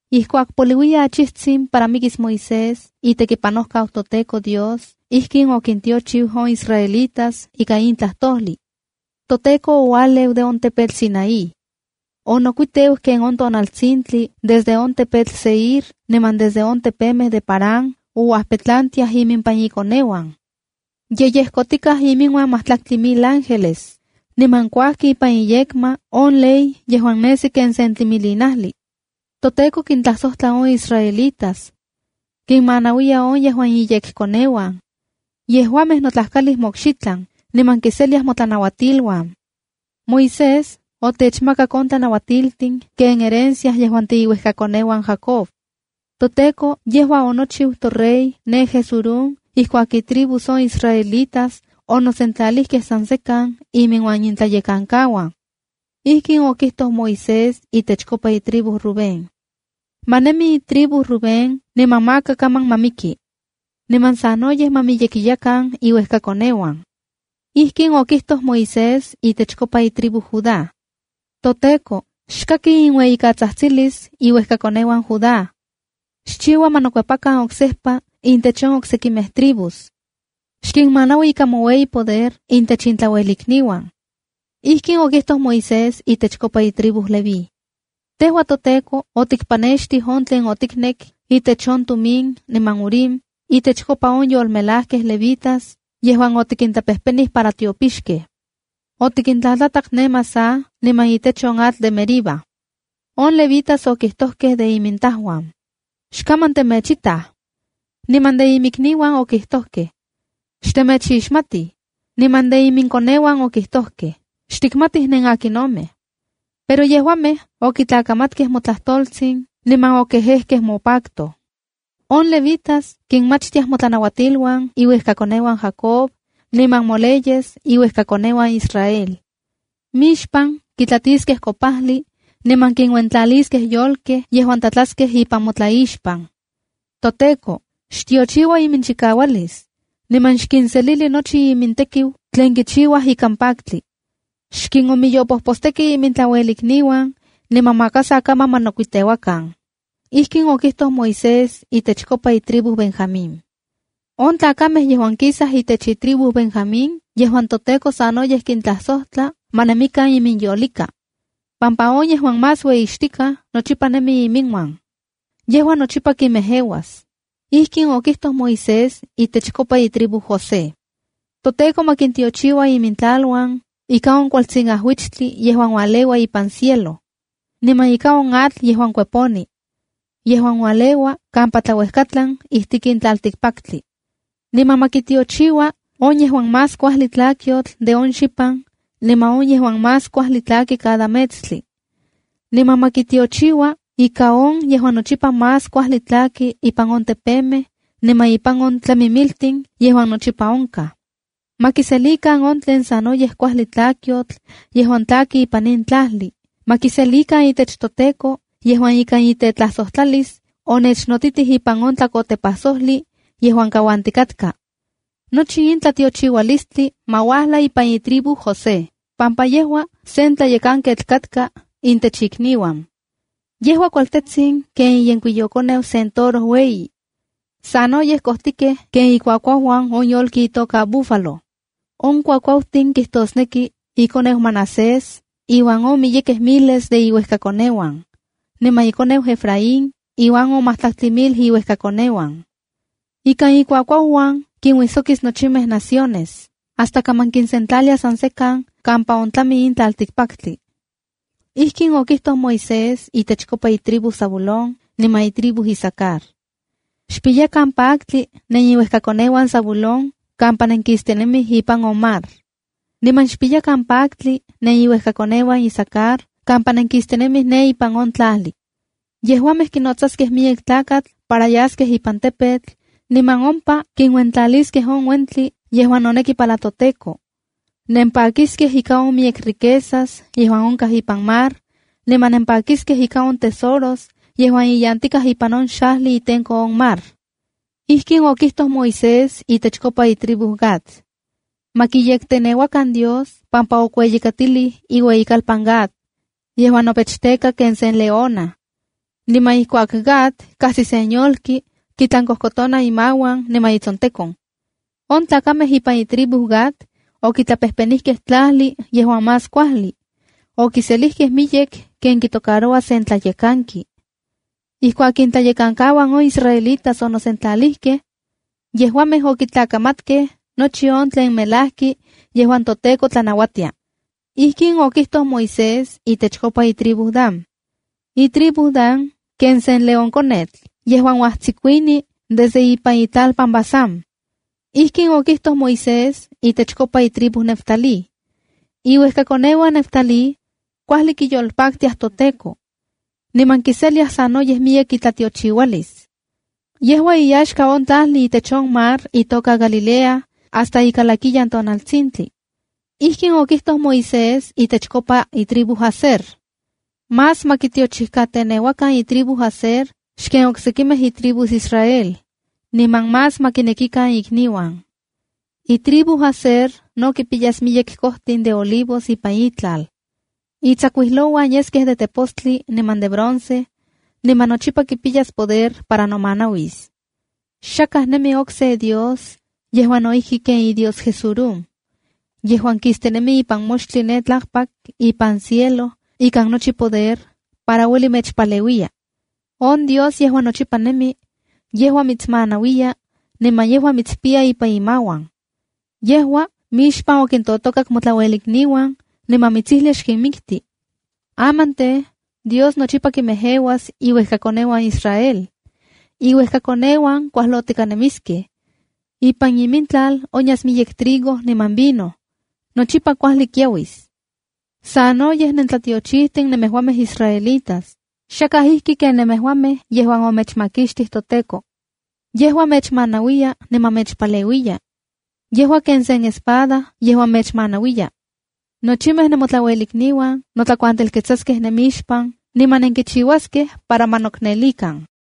Ijkuak poliuiya achijtsin para mikis Moisés, itekipanojkau toTEKO Dios, ijkin okintiochiu on israelitas ika in tlajtojli: “ToTEKO oualeu de on tepetl Sinaí. Onokuiteu ken on tonaltsintli, desde on tepetl Seir niman desde on tepemej de Parán ouajpetlantiaj imimpan ikoneuan. Ye yejkotikaj iminuan matlaktli mil ángeles, niman kuajki ipan iyekma on ley yejuan nesi ken sen tlimilinajli. ToTEKO kintlajsojtla on israelitas. Kinmanauiya on yejuan iyekkoneuan. Yejuamej notlajkalij mokxitlan, niman kiseliaj motlanauatiluan. Moisés otechmakak on tlanauatiltin ken herencia yejuan tiiuejkakoneuan Jacob. ToTEKO yejua onochiu torey ne Jesurún ijkuak itribus on israelitas onosentlalijkej san sekan iminuan intlayekankauan.” Ijkin okijtoj Moisés itechkopa itribu Rubén: “¡Ma nemi itriubu Rubén niman maka kaman ma miki! Niman sanoyej ma miyekiyakan iuejkakoneuan.” Ijkin okijtoj Moisés itechkopa itribu Judá: “ToTEKO, xkaki inueyikatsajtsilis iuejkakoneuan Judá. Xchiua ma nokuepakan oksejpa intech on oksekimej tribus. Xkinmanaui ika moueyipoder intech intlauelikniuan.” Ijkin okijtoj Moisés itechkopa itribu Leví: “Tejua, toTEKO, otikpanextij on tlen otiknek itech on Tumim niman Urim itechkopa on yolmelajkej levitas yejuan otikintlapejpenij para tiopixkej. Otikintlatlatak ne Masah niman itech on atl de Meriba. On levitas okijtokej de imintajuan: ‘xkaman temechitaj’, niman de iminikniuan okijtokej: ‘xtemechixmatij’, niman de iminkoneuan okijtojkej: ‘xtikmatij nenakinomej’. Pero yejuamej okitlakamatkej motlajtoltsin niman okejekej mopacto. On levitas kinmachtiaj motlanauatiluan iuejkakoneuan Jacob, niman moleyes iuejkakoneuan Israel. Mixpan kitlatiskej kopajli, niman kinuentlaliskej yolkej yejuan tlatlaskej ipan motlaixpan. ToTEKO, xtiochiua iminchikaualis, niman xkinselili nochi imintekiu tlen kichiuaj ikan paktli. Xkinnomiyopojposteki imintlauelikniuan, niman maka sa kaman ma nokuiteuakan.” Ijkin okijtoj Moisés itechkopa itribu Benjamín: “On tlakamej yejuan kisaj itech itribu Benjamín yejuan toTEKO sanoyej kintlajsojtla ma nemikan iminyolika, pampa on yejuan “Más Ueyixtikaj” nochipa nemi iminuan. Yejua nochipa kinmejeuas.” Ijkin okijtoj Moisés itechkopa itribu José: “ToTEKO ma kintiochiua imintlaluan ika on kualtsin ajuichtli yejuan ualeua ipan cielo, niman ika on atl yejuan kueponi, yejuan ualeua kampa tlauejkatlan ijtik in tlaltikpaktli. Niman ma kitiochiua ika on yejuan más kuajli tlakyotl de on xipan niman on yejuan más kuajli tlaki cada metstli. Niman ma kitiochiua ikan on yejuan nochipa más kuajli tlaki ipan on tepemej, niman ipan on tlamimiltin yejuan nochipa onkaj. Ma kiselikan on tlen sanoyej kuajli tlakyotl yejuan tlaki ipan in tlajli. Ma kiselikan itech toTEKO yejuan ikan itetlajsojtlalis onechnotitij ipan on tlakotepajsojli yejuan kauantikatka. Nochi in tlatiochiualistli ma uajla ipan itribu José, pampa yejua sen tlayekanketl katka intech ikniuan. Yejua kualtetsin ken iyenkuiyokoneu sen toro ueyi. ¡Sanoyej kojtikej ikuakuauuan ken ikuakuauuan on yolki itoka búfalo! On kuakuautin kitosneki ikoneu Manasés iuan on miyekej miles de iuejkakoneuan, niman ikoneu Efraín iuan on matlaktli mil iuejkakoneuan. Ikan ikuakuauuan, kinuijsokis nochimej naciones, hasta kaman kinsentlalia san sekan kampa ontlami in tlaltikpaktli.” Ijkin okijtoj Moisés itechkopa itribu Zabulón niman itribu Isacar: “Xpiyakan paktli neniuejkakoneuan Zabulón kampa nenkistinemij ipan on mar, niman xpiyakan paktli neniuejkakoneuan Isacar kampa nenkistinemij ne ipan on tlajli. Yejuamej kinotsaskej miyek tlakatla para yaskej ipan tepetl, niman ompa kinuentlaliskej on uentli yejuan noneki para toTEKO. Nempakiskej ika on miyek riquezas yejuan onkaj ipan mar, niman nempakiskej ika on tesoros yejuan iyantikaj ipan on xajli itenko on mar.” Ijkin okijtoj Moisés itechkopa itribu Gad: “Ma kiyekteneuakan Dios pampa okueyikatilij iueyitlalpan Gad, yejuan nopechteka ken sen leona. Niman ijkuak Gad kajsi sen yolki, kitlankojkotona imauan niman itsontekon. On tlakamej ipan itribu Gad, okitlapejpenikej tlajli yejuan más kuajli. Okiselijkej miyek ken kitocaroua sen tlayekanki. Ijkuak intlayekankauan on israelitas onosentlalijkej, yejuamej okitlakamatkej nochi on tlen melajki yejuan toTEKO tlanauatia.” Ijkin okijtoj Moisés itechkopa itribu Dan: “Itribu Dan ken sen leónkonetl yejuan uajtsikuini desde ipan itlalpan Basán.” Ijkin okijtoj Moisés itechkopa itribu Neftalí: “Iuejkakoneuan Neftalí, kuajli kiyolpaktiaj toTEKO, niman kiseliaj sanoyej miyek itlatiochiualis. Yejua iyaxka on tlajli itech on mar itoka Galilea hasta ikalakiyan tonaltsintli.” Ijkin okijtoj Moisés itechkopa itribu Aser: “Más ma kitiochijkateneuakan itribu Aser xken oksekimej itribus Israel. Niman más ma kinekikan ikniuan. Itribu Aser no kipiyas miyek kojtin de olivos ipan itlal. Itsakuijlouan yeskej de tepostli niman de bronce, niman nochipa kipiyas poder para nomanauis. ’Xakaj okse dios ijki nemi ken iDios Jesurúnb, yejuan kistinemi ipan moxtli ne tlakpak ipan cielo ikan nochi ipoder para ueli mechpaleuiya. On Dios yejuan nochipa nemi, yejua mitsmanauiya, niman yejua mitspiya ipan imauan. Yejua mixpan okintotokak motlauelikniuan, niman mitsijlia xkinmikti. Aman tej, Dios nochipa kinmejeuas iuejkakoneuan Israel. Iuejkakoneuan kuajlotika nemiskej. Ipan imintlal onyas miyek trigo niman vino. Nochipa kuajli kiauis. ¡Sanoyej nentlatiochijtin nemejuamej israelitas! Xakaj ijki ken nemejuamej yejuan omechmakixtij toTEKO. Yejua mechmanauiya niman mechpaleuiya. Yejua ken sen espada yejuan mechmanauiya. Nochimej nemotlauelikniuan notlakuantelketsaskej nemixpan, niman nenkichiuaskej para ma noknelikan.”